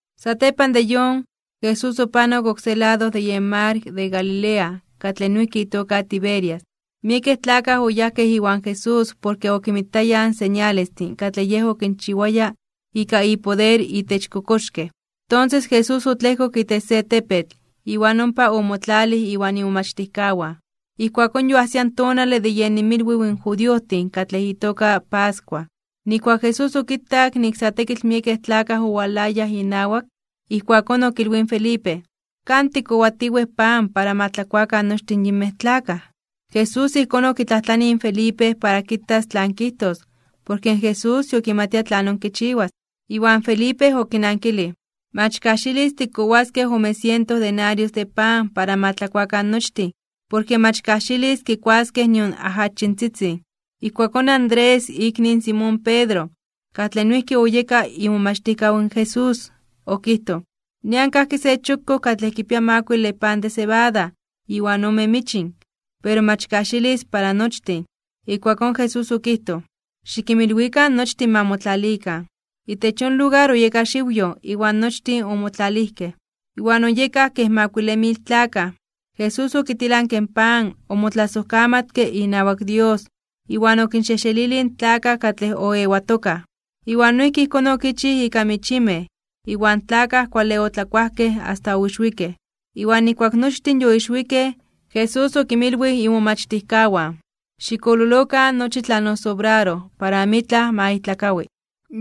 Satepan de yon, Jesús opanok oksé lado de yen mar de Galilea katlej noijki itoka Tiberias. Miekej tlakaj oyajkej iwan Jesús porke okinmitayaj in señalestin katlej Yej okinchiwaya ika ipoder itech in kokoxkej. Tonses Jesús otlejkok itech se tepetl, iwan ompa omotlalij iwan imomachtijkawan. Ijkuakón yoajsia in tonale de yen inmilwiw in judiojtin katlej itoka pascua. Nijkuak in Jesús okitak nik sa tekitl miekej tlakaj owalayaj inawak, ijkuakón okilwij in Felipe: ―¿Kan tikkowatiwej pan para ma tlakuakan nochtin yinmej tlakaj? Jesús ijkón okitlajtlanij in Felipe para kitas tlan kijtos, porke in Jesús yokimatia tlanon kichiwas. Iwan Felipe okinankilij: ―Mach kajxilis tikkowaskej ome siento denarios de pan para ma tlakuakan nochtin, porke mach kajxilis kikuaskej nion ajachintzitzin. Ijkuakón in Andrés, ikni in Simón Pedro, katlej noijki oyeka imomachtijkaw in Jesús, okijtoj: ―Nian kajki se chokkoj katlej kipia makuile pan de sebada iwan ome michin, pero mach kajxilis para nochtin. Ijkuakón Jesús okijtoj: ―Xikinmilwikan nochtin ma motlalikan. Itech yon lugar oyeka xiwyoj, iwan nochtin omotlalijkej. Iwan oyekaj kej makuile mil tlakaj. Jesús okitilanke in pan, omotlasojkamatke inawak Dios, iwan okinxejxelilij in tlakaj katlej oewatokaj. Iwan noijki ijkón okichij ika michimej, iwan tlakaj kuale otlakuajkej asta oixwikej. Iwan nijkuak nochtin yoixwikej, in Jesús okinmilwij imomachtijkawan: ―Xikololokan nochi tlan osobraroj para amitlaj ma ijtlakawi.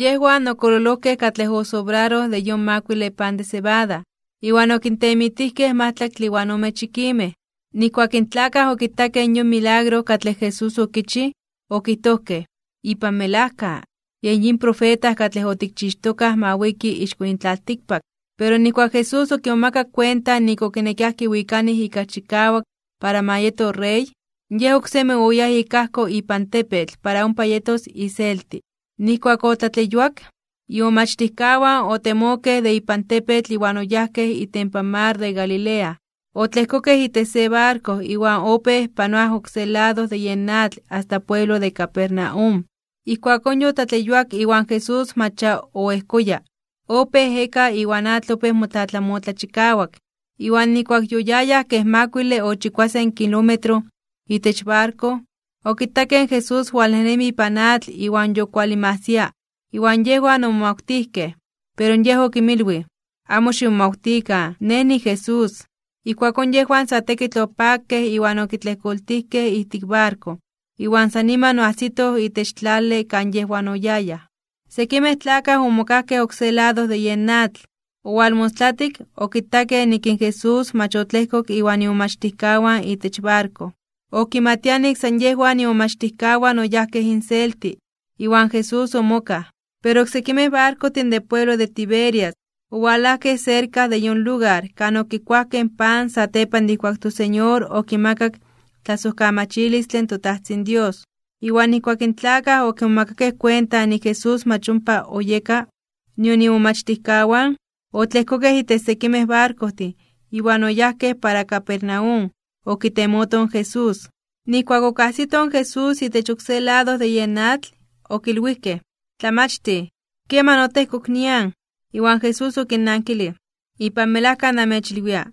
Yejwan okololojkej katlej osobraroj de yon makuile pan de sebada, iwan okintemitijkej majtlaktle iwan ome chikimej. Nijkuak in tlakaj okitakej yon milagro katlej Jesús okichij, okijtojkej: ―Ipan melajka, yen yin profeta katlej otikchixtokaj ma wiki ixko yin tlaltikpak. Pero nijkuak in Jesús okimomakak kuenta nik okinekiaj kiwikanij ika chikawak para ma yeto rey, in Yej oksemi oyáj ik ajko ipan tepetl para ompa yetos iselti. Nijkuak otlatleyuak, imomachtijkawan otemokej de ipan tepetl iwan oyajkej itempan mar de Galilea, otlejkokej itech se barko iwan opéj panoaj oksé lado de yen atl asta pueblo de Capernaum. Ijkuakón yotlatleyuak iwan Jesús mach ya oejkoya. Opéj ejeka iwan atl opéj motlatlamotla chikawak. Iwan nijkuak yoyayaj kej makuile o chikuasen kilómetro itech barko, okitakej in Jesús walnejnemi ipan atl iwan yokualinmajsia. Iwan yejwan omomawtijkej. Pero Yej okinmilwij: ―Amo ximomawtikan, Nej niJesús. Ijkuakón yejwan sa tekitl opakej iwan okitlejkoltijkej ijtik barko. Iwan san niman oajsitoj itech tlale kan yejwan oyayaj. Sekimej tlakaj omokajkej oksé lado de yen atl. Owalmostlatik, okitakej nik in Jesús mach otlejkok iwan imomachtijkawan itech barko. Okimatiaj nik san yejwan imomachtijkawan oyajkej inselti, iwan Jesús omokaj. Pero oksekimej barkojtin de pueblo de Tiberias, owalajkej serka de yon lugar kan okikuajkej pan satepan de ijkuak in toSeñor okimakak tlasojkamachilistle in toTajtzin Dios. Iwan nijkuak in tlakaj okimomakakej kuenta nik in Jesús mach ompa oyeka, nion imomachtijkawan, otlejkokej itech sekimej barkojtin, iwan oyajkej para Capernaum okitemotoj in Jesús. Nijkuak okajsitoj in Jesús itech oksé lado de yen atl, okilwijkej: ―Tlamachtij, ¿keman otejkok nian? Iwan Jesús okinnankilij: ―Ipan melajka namechilwia,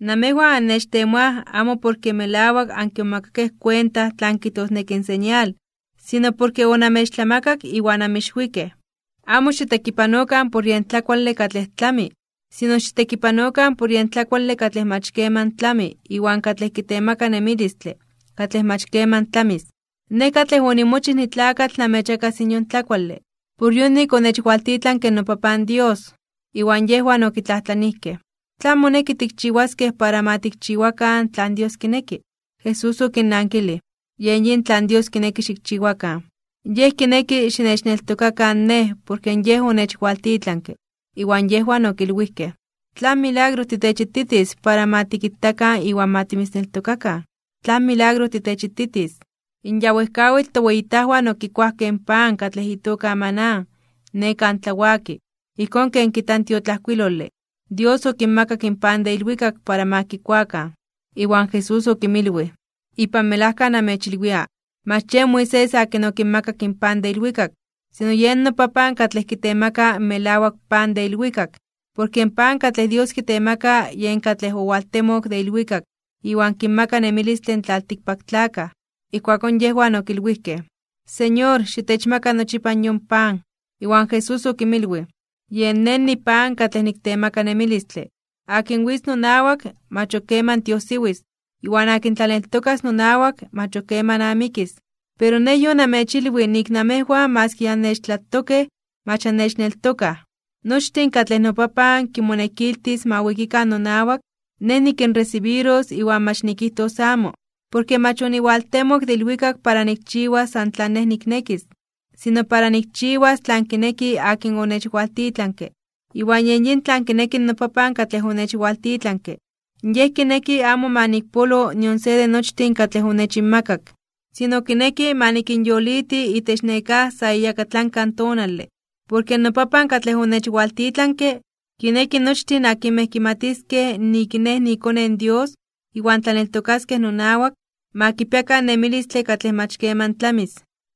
namejwan annechtemoaj amo porke melawak ankimomakakej kuenta tlan kijtosneki in señal, sino porke onamechtlamakak iwan anmixwikej. Amo xitekipanokan por yen tlakuale katlej tlami, sino xitekipanokan por yen tlakuale katlej mach keman tlami iwan katlej kitemaka nemilistle katlej mach keman tlamis. Nej katlej onimochij nitlakatl namechmakas yon tlakuale, por yonik onechwaltitlanke noPapan Dios. Iwan yejwan okitlajtlanijkej: ―¿Tlan moneki tikchiwaskej para ma tikchiwakan tlan Dios kineki? Jesús okinnankilij: ―Yen yin tlan Dios kineki xikchiwakan. Yej kineki xinechneltokakan Nej porke Yej onechwaltitlanke. Iwan yejwan okilwijkej: ―¿Tlan milagro titechititis para ma tikitakan iwan para ma timitzneltokakan? ¿Tlan milagro titechititis? In ya wejkawitl toweyitajwan okikuajkej in pan katlej itoka maná, ne kan tlawaki. Ijkón ken kijta in tiotlajkuilole: “Dios okinmakak pan de ilwikak para ma kikuakan.” Iwan Jesús okinmilwij: ―Ipan melajka namechilwia: Mach yen Moisés akin okinmakak in pan de ilwikak, sino yen noPapan katlej kitemaka in melawak pan de ilwikak. Porke in pan katlej Dios kitemaka yen katlej owaltemok de ilwikak iwan kinmaka nemilistle in tlaltikpaktlakaj. Ijkuakón yejwan okilwijkej: ―Señor, xitechmaka nochipa yon pan. Iwan Jesús okinmilwij: ―Yen Nej nipan katlej niktemaka nemilistle. Akin witz nonawak, mach ok keman tiojsiwis. Iwan akin tlaneltokas nonawak, mach ok keman amikis. Pero Nej yonamechilwij nik namejwan maski ya annechtlatokej mach annechneltokaj. Nochtin katlej noPapan kimonekiltis ma wikikan nonawak, Nej nikinresibiros iwan mach nikijtos amo. Porke mach oniwaltemok de ilwikak para nikchiwas san tlan Nej niknekis, sino para nikchiwas tlan kineki akin onechwaltitlanke. Iwan noPapan katlej onechwaltitlanke, amo kineki ma nikpolo nion se de nochtin katlej onechinmakak, sino kineki ma nikinyoliti itech nekáj sa iyakatlanka tonale. Porke noPapan katlej onechwaltitlanke, kineki nochtin akinmej kimatiskej nik Nej niiKone in Dios iwan tlaneltokaskej nonawak, ma kipiakan nemilistle katlej mach keman tlamis.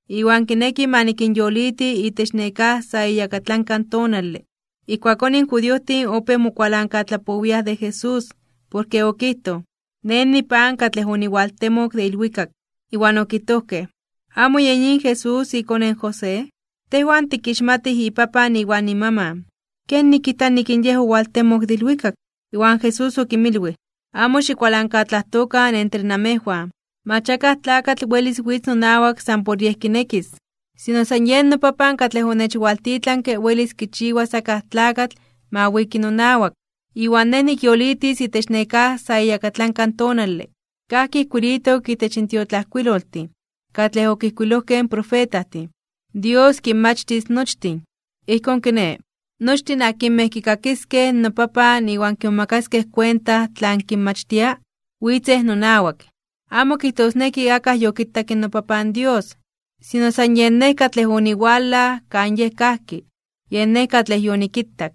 Iwan kineki ma nikinyoliti itech nekáj sa iyakatlanka tonale. Ijkuakón in judiojtin opéj mokualankatlapowiaj de Jesús, porke okijtoj: “Nej nipan katlej oniwaltemok de ilwikak.” Iwan okijtojkej: ―¿Amo yen yin Jesús, ikone in José? Tejwan tikixmatij ipapan iwan imaman. ¿Kenik kijta nik in Yej owaltemok de ilwikak? Iwan Jesús okinmilwij: ―Amo xikualankatlajtokan entre namejwan. Mach akaj tlakatl welis witz nonawak san por yej kinekis. Sino san yen noPapan katlej onechwaltitlanke welis kichiwas akaj tlakatl ma wiki nonawak. Iwan Nej nikyolitis itech nekáj sa iyakatlanka tonale. Kajki ijkuilitok itech in tiotlajkuiloltin katlej okijkuilojkej in profetajtin: “Dios kinmachtis nochtin.” Ijkón kiné, nochtin akinmej kikakiskej noPapan iwan kimomakaskej kuenta tlan kinmachtia, witzej nonawak. ’Amo kijtosneki akaj yokitak in noPapan Dios, sino san yen Nej katlej oniwalaj kan Yej kajki, yen Nej katlej yonikitak.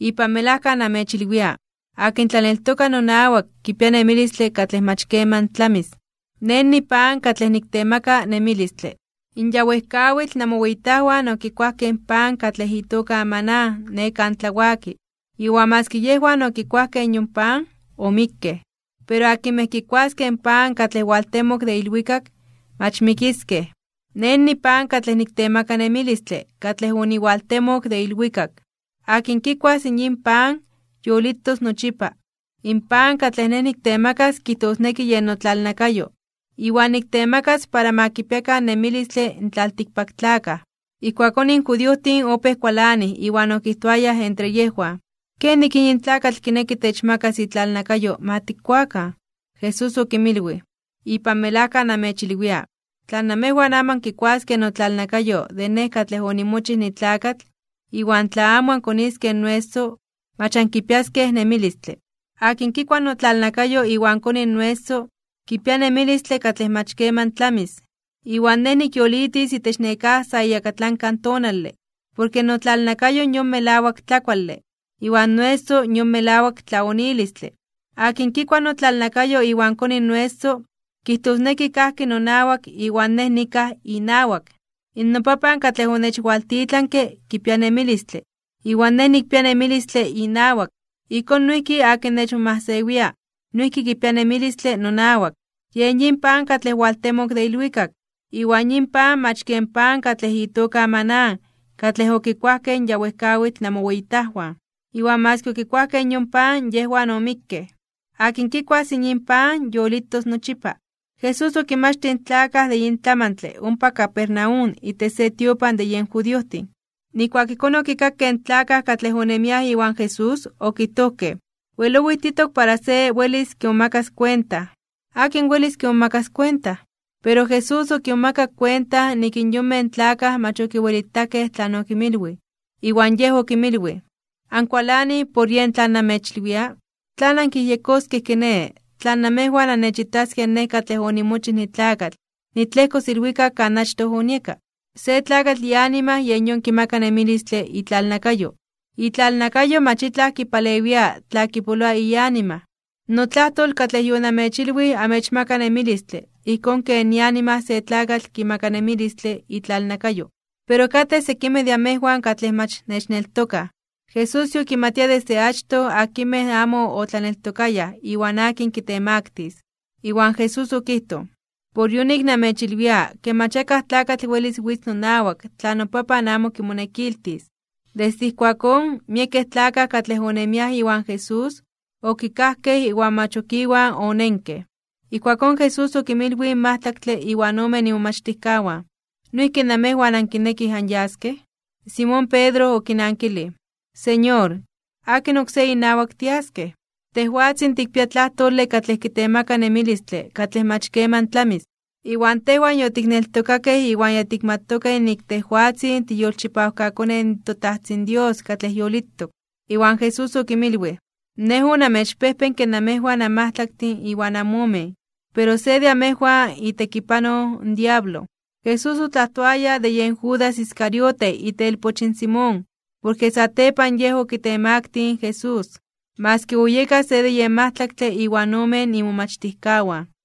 Ipan melajka namechilwia: Akin tlaneltoka nonawak kipia nemilistle katlej mach keman tlamis. Nej nipan katlej niktemaka nemilistle. In ya wejkawitl namoweyitajwan okikuajkej in pan katlej itoka maná ne kan tlawaki, iwan maski yejwan okikuajkej yon pan, omikkej. Pero akinmej kikuaskej in pan katlej owaltemok de ilwikak, mach mikiskej. Nej nipan katlej niktemaka nemilistle katlej oniwaltemok de ilwikak. Akin kikuas yin pan, yolitos nochipa. In pan katlej nej niktemakas kijtosneki yen notlalnakayo, iwan niktemakas para ma kipiakan nemilistle in tlaltikpaktlakaj. Ijkuakón in judiojtin opéj kualanij iwan okijtoayaj entre yejwan: ―¿Kenik yin tlakatl kineki techmakas itlalnakayo ma tikuakan? Jesús okinmilwij: ―Ipan melajka namechilwia: Tla namejwan amo ankikuaskej notlalnakayo de Nej katlej onimochij nitlakatl, iwan tla amo ankoniskej noeso, mach ankipiaskej nemilistle. Akin kikua notlalnakayo iwan koni noeso, kipia nemilistle katlej mach keman tlamis, iwan Nej nikyolitis itech nekáj sa iyakatlanka tonale. Porke notlalnakayo yon melawak tlakuale, iwan noeso yon melawak tlaonilistle. Akin kikua notlalnakayo iwan koni noeso, kijtosneki kajki nonawak iwan Nej nikaj inawak. NoPapan katlej onechwaltitlanke, kipia nemilistle, iwan Nej nikpia nemilistle inawak. Ijkón noijki akin nechmomajsewia, noijki kipia nemilistle nonawak. Yen yin pan katlej owaltemok de ilwikak, iwan yin pan mach ken pan katlej itoka maná katlej okikuajkej in ya wejkawitl namoweyitajwan, iwan maski okikuajkej yon pan yejwan omikkej. Akin kikuas yin pan yolitos nochipa. Jesús okinmachtij in tlakaj de yin tlamantle ompa Capernaum itech se tiopan de yen judiojtin. Nijkuak ijkón okikakej in tlakaj katlej onemiaj iwan Jesús, okijtojkej: ―Wel owijtitok para se welis kimomakas kuenta. ¿Akin welis kimomakas kuenta? Pero Jesús okimomakak kuenta nik in yonmej tlakaj mach okiwelitakej tlan okinmilwij, iwan Yej okinmilwij: ―¿Ankualanij por yen tlan namechilwia? ¿Tlan ankiyejyekoskej kiné, tla namejwan annechitaskej Nej katlej onimochij nitlakatl nitlejkos ilwikak kan achtoj onieka? Se tlakatl ianima yen yon kimaka nemilistle itlalnakayo. Itlalnakayo mach itlaj kipalewia tla kipoloa ianima. Notlajtol katlej yonamechilwij amechmaka nemilistle ijkón ken ianima se tlakatl kimaka nemilistle itlalnakayo. Pero katej sekimej de amejwan katlej mach nechneltokaj. Jesús yokimatia desde achtoj akinmej amo otlaneltokayaj iwan akin kitemaktis (kitemaktilis). Iwan Jesús okijtoj: ―Por yonik namechilwia ke mach akaj tlakatl welis witz nonawak tla noPapan amo kimonekiltis. Desde ijkuakón, miekej tlakaj katlej onemiaj iwan Jesús, okikajkej iwan mach ok Iwan onenkej. Ijkuakón Jesús okinmilwij in majtlaktle iwan omen imomachtijkawan: ―¿Noijki namejwan ankinekij anyaskej? Simón Pedro okinankilij: ―Señor, ¿akin oksé inawak tiaskej? Tejwatzin tikpia tlajtole katlej kitemaka nemilistle katlej mach keman tlamis. Iwan tejwan yotikneltokakej iwan ya tikmatokej nik tejwatzin tiiyolchipawkaKone in toTajtzin Dios katlej yolitok. Iwan Jesús okinmilwij: ―Nej onamechpejpenke namejwan anmajtlaktin iwan amomen, pero se de amejwan itekipanoj in diablo. Jesús otlajtoaya de yen Judas Iscariote itelpoch in Simón, porke satepan yen okitemaktij (okitemaktilij) in Jesús, maski oyeka se de yen majtlaktle iwan omen imomachtijkawan.